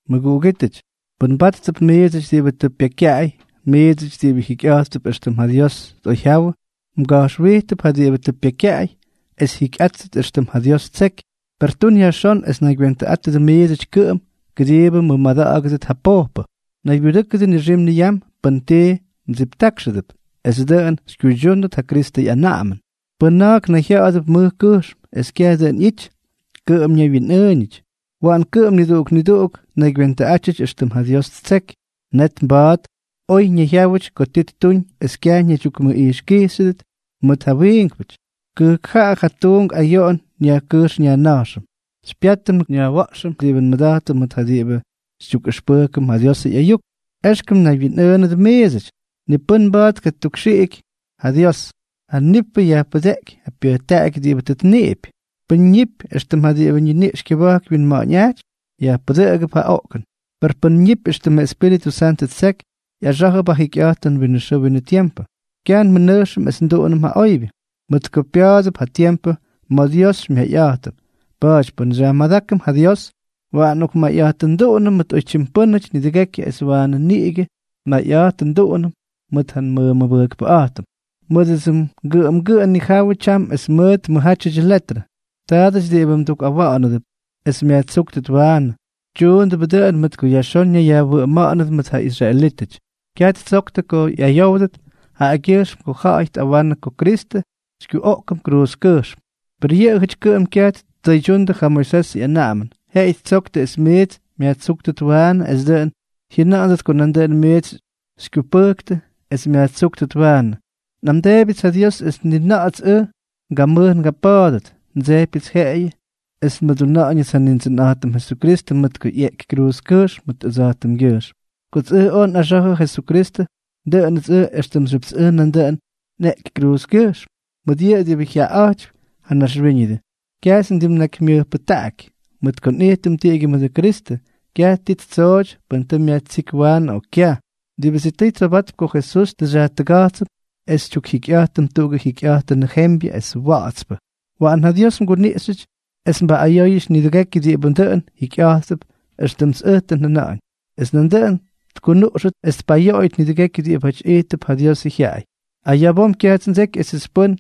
Mʉguꞌugítʉty, pʉn mbáttʉp miidsʉty diꞌibʉ tʉ pyekykyaꞌay, miidsʉty diꞌibʉ jikyꞌa̱jttʉp éxtʉm ja Dios tꞌoyjyawʉ, mga̱jxwijtʉp ja diꞌibʉ tʉ pyekykyaꞌay es jyikyꞌátʉt éxtʉm ja Dios ttseky. Per tun yajxón es naygywentʉꞌátʉdʉ miidsʉty kʉꞌʉm kʉdiibʉ mmʉmada̱ꞌa̱gʉdʉt ja pojpʉ. Naybyudʉ́kʉdʉ nixim niyam pʉn ti mdsiptákxʉdʉp, es dʉꞌʉn xykyuydyúndʉt ja Kristʉ ꞌyanaꞌamʉn. Pʉn na̱a̱k nayjya̱ꞌa̱dʉp mʉj kʉjxm, es kyaj dʉꞌʉn ꞌyity, kʉꞌʉm ñaywyinꞌʉʉñʉty. Waꞌan kʉꞌʉm niduꞌuk niduꞌuk tnaygywentʉꞌátyʉty éxtʉm ja Dios ttseky, net mba̱a̱t oy ñayjyáwʉt ko ti ttuñ es kyaj ñaydyukmʉꞌijxkijxyʉt mʉt ja wiinkpʉty. Kʉjkjaꞌa ja tuunk ayoꞌon nyajkʉjx nyajna̱jxʉm. Xypyátʉm nyajwa̱ꞌxʉm diꞌibʉ nmʉda̱jtʉm mʉt ja diꞌibʉ xytyukꞌʉxpʉjkʉm ja Diosʉ ꞌyayuk. Exkʉm mnaywyinꞌʉʉnʉdʉ miidsʉty: ni pʉ́n mba̱a̱t tkatukxiꞌiky ja Dios. Ja nippʉ yajpʉdeꞌkypy ja pyʉjtaꞌaky diꞌibʉ tʉ tniꞌipy. Pʉ́n ñipy éxtʉm ja diꞌibʉ ñiniꞌx kyʉba̱jk wyinma̱ꞌa̱ñꞌajtypy, yajpʉdʉꞌʉgʉp ja oꞌkʉn; per pʉ́n ñipy éxtʉmʉ Espíritʉ Santʉ ttseky, ꞌyaxá̱jʉp ja jikyꞌa̱jtʉn winʉ xʉʉ winʉ tiempʉ. Kyaj nmʉꞌanuꞌxʉm es nduꞌunʉm ja oybyʉ; mʉt ko pya̱a̱dʉp ja tiempʉ ma̱ Dios xymyayꞌa̱jtʉm. Pa̱a̱ty pʉn xyajmadákʉm ja Dios, waꞌan nmayꞌa̱jtʉnduꞌunʉm mʉt oytyim pʉ́nʉty nidʉgékyʉty, es waanʉ niꞌigʉ nmayꞌa̱jtʉnduꞌunʉm mʉt ja nmʉmʉbʉjkpʉꞌa̱jtʉm. Mʉdʉdsʉ ngʉꞌʉmgʉꞌʉ nnijáyʉdʉ tyam es mʉt mʉjjátyʉdyʉ letrʉ. Taadʉty diꞌibʉ mdukkuwa̱ꞌa̱nʉdʉp es myajtsúktʉt waanʉ, tyuundʉbʉ dʉꞌʉn mʉt ko yajxón ñayyajwʉꞌʉma̱ꞌa̱nʉdʉ mʉt ja israelítʉty, kyaj ttsoktʉ ko ꞌyayówdʉt jaꞌagyʉjxm ko ja̱ꞌa̱y tꞌawanʉ ko Kristʉ xykyuꞌoꞌkʉm kruuzkʉjxm. Per yʉꞌʉjʉty kʉꞌʉm kyaj tkuydyundʉ ja Moisesʉ anaꞌamʉn, jeꞌeyʉ ttsoktʉ es miits myajtsúktʉt waanʉ es dʉꞌʉn jyʉna̱ꞌa̱ndʉt ko nandʉꞌʉn miits xykyupʉjktʉ es myajtsúktʉt waanʉ. Nꞌamdeebyʉts ja Dios es ni na̱ꞌa̱ts ʉj ngamʉj ngapa̱a̱dʉt. Ndsejpyʉts jeꞌeyʉ es nmʉduna̱ꞌa̱ñʉts ja Nindsʉnꞌa̱jtʉm Jesukristʉ mʉt ko ꞌyeꞌky kruuzkʉjxm mʉt ʉjtskyʉjxm. Kots ʉj oj nꞌaxa̱jʉ Jesukristʉ, dʉꞌʉnʉts ʉj éxtʉmxyʉpts ʉj nandʉꞌʉn nꞌeꞌky kruuzkʉjxm. Mʉt yʉꞌʉ diꞌibʉ jyaꞌaꞌa̱jtypy ja naxwíñʉdʉ, kyajts ndimnakymyʉjpʉjtaꞌaky. Mʉt ko nꞌijtʉm tiꞌigyʉ mʉdʉ Kristʉ, kyaj ti ttsooty pʉn tʉ myajtsíky waanʉ o kyaj. Diꞌibʉ sitʉy tsobatp ko Jesús tʉ xyajtʉga̱jtsʉm es xytyukjikyꞌa̱jtʉm tuꞌugʉ jikyꞌa̱jtʉnʉ jembyʉ es wa̱ꞌa̱tspʉ. Waꞌan ja Dios mguniꞌxyʉty es mbaꞌꞌayóyʉty nidʉgekyʉ diꞌibʉ dʉn jikyꞌa̱jttʉp éxtʉmts ʉj tʉ njʉna̱ꞌa̱ñ, es nandʉꞌʉn tkunuꞌxʉt es tpaꞌꞌayóyʉt nidʉgekyʉ diꞌibáty ijttʉp ja Diosʉ jyaꞌay. Aya̱ bom kyajts ndseky esʉts pʉ́n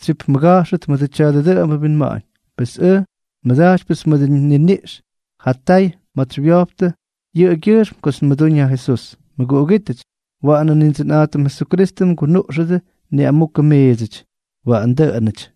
xytsyipmʉga̱jxʉt mʉdʉ tya̱dʉ dʉꞌʉmbʉ winma̱ꞌa̱ñ. Pes ʉj nmʉda̱jtypyʉts ma̱dsʉ nniniꞌx ja tay ma̱ts xywyojptʉ yʉꞌʉgyʉjxm kots nmʉdúñ ja Jesús. Mʉguꞌugítʉty, waꞌanʉ Nindsʉnꞌa̱jtʉm Jesukristʉ mgunuꞌxʉdʉ niꞌamukʉ miidsʉty. Waꞌan dʉꞌʉnʉty.